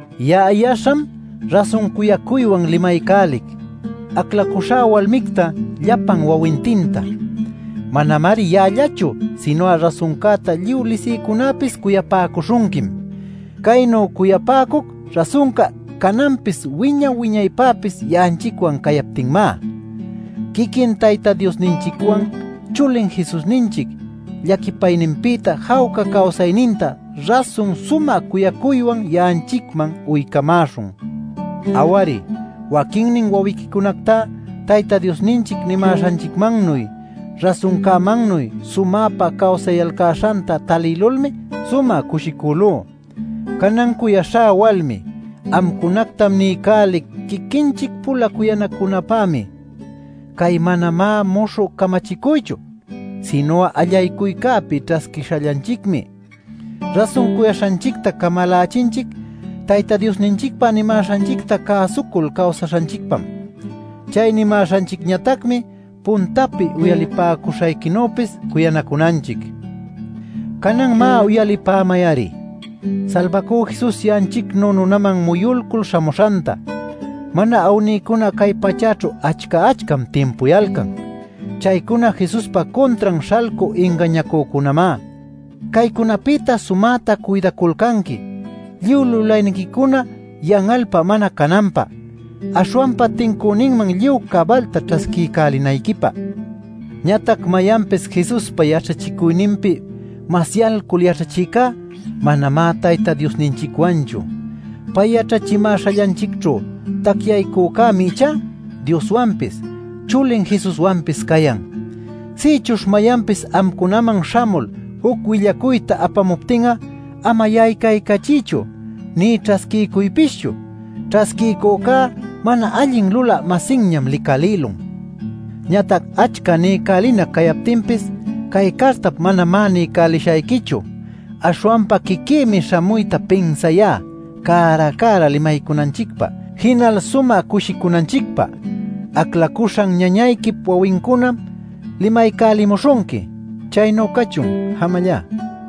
Ya'a yaśham rasun cuyacuywan limaycälic, aclacuśhá walmicta llapan wawintinta. Manamari ya'allachu sinu'a rasuncäta lluy lisïcunäpis cuyapäcuśhunquim. Caynu cuyapäcuc rasunca cananpis wiña-wiñaypäpis ya'anchicwan cayaptinñamá. Quiquin Tayta Diosninchicwan, chulin Jesusninchic llaquipayninpïta jawca cawsayninta rasun sumä cuyacuywan ya'anchicman uycamäśhun. Aw-ari, waquinnin wawiquicunacta Tayta Diosninchic nimäśhanchicmannuy rasuncämannuy sumäpa cawsayalcäśhanta talïlulmi sumä cushicülú. Canan cuyaśhá walmi, amcunacta niycälic quiquinchic-pula cuyanacunapämi. Cay manamá muśhü camachicuychu, sinu'a allaycuycäpi ćhasquishallanchicmi. Rasun cuyaśhanchicta camalachinchic Tayta Diosninchicpa nimäśhanchicta cäsucul cawsaśhanchicpam. Chay nimäśhanchicñatacmi puntapi uyalipäcuśhayquinüpis cuyanacunanchic. Canan, má, uyalipämay-ari: “Salbacü Jesus ya'anchicnu nunaman muyulcul śhamuśhanta” mana awnïcuna cay pachäćhu achca-achcam timpuyalcan. Chaycuna Jesuspa cuntran śhalcü ingañacücunamá. Caycunapïta sumätam cuydaculcanqui, lluy lulayniquicuna yan'alpä mana cananpä, aśhwanpa tincüninman lluy cabalta ćhasquiycälinayquipä. Ñatac mayanpis Jesuspa yaćhachicuyninpi masyalcul yaćhachïcá, manamá Tayta Diosninchicwanchu. Pay yaćhachimäśhallanchicćhu tacyaycücämi ichá Dioswanpis, chulin Jesuswanpis cayan. Sïchuśh mayanpis amcunaman śhamul, juc willacuyta apamuptin'a ama yaycaycachiychu nï ćhasquiycuypischu. Ćhasquiycücá mana allin lulä-masinñam licalïlun. Ñatac achca niycälinac cayaptinpis cay cartap manamá niycälishayquichu. Aśhwanpa quiquïmi śhamuyta pinsayá cära-cära limaycunanchicpä jinal sumä cushicunanchicpä. Aclacuśhan ñañayquip wawincunam limaycälimuśhunqui. Chaynu cachun. Jamallá.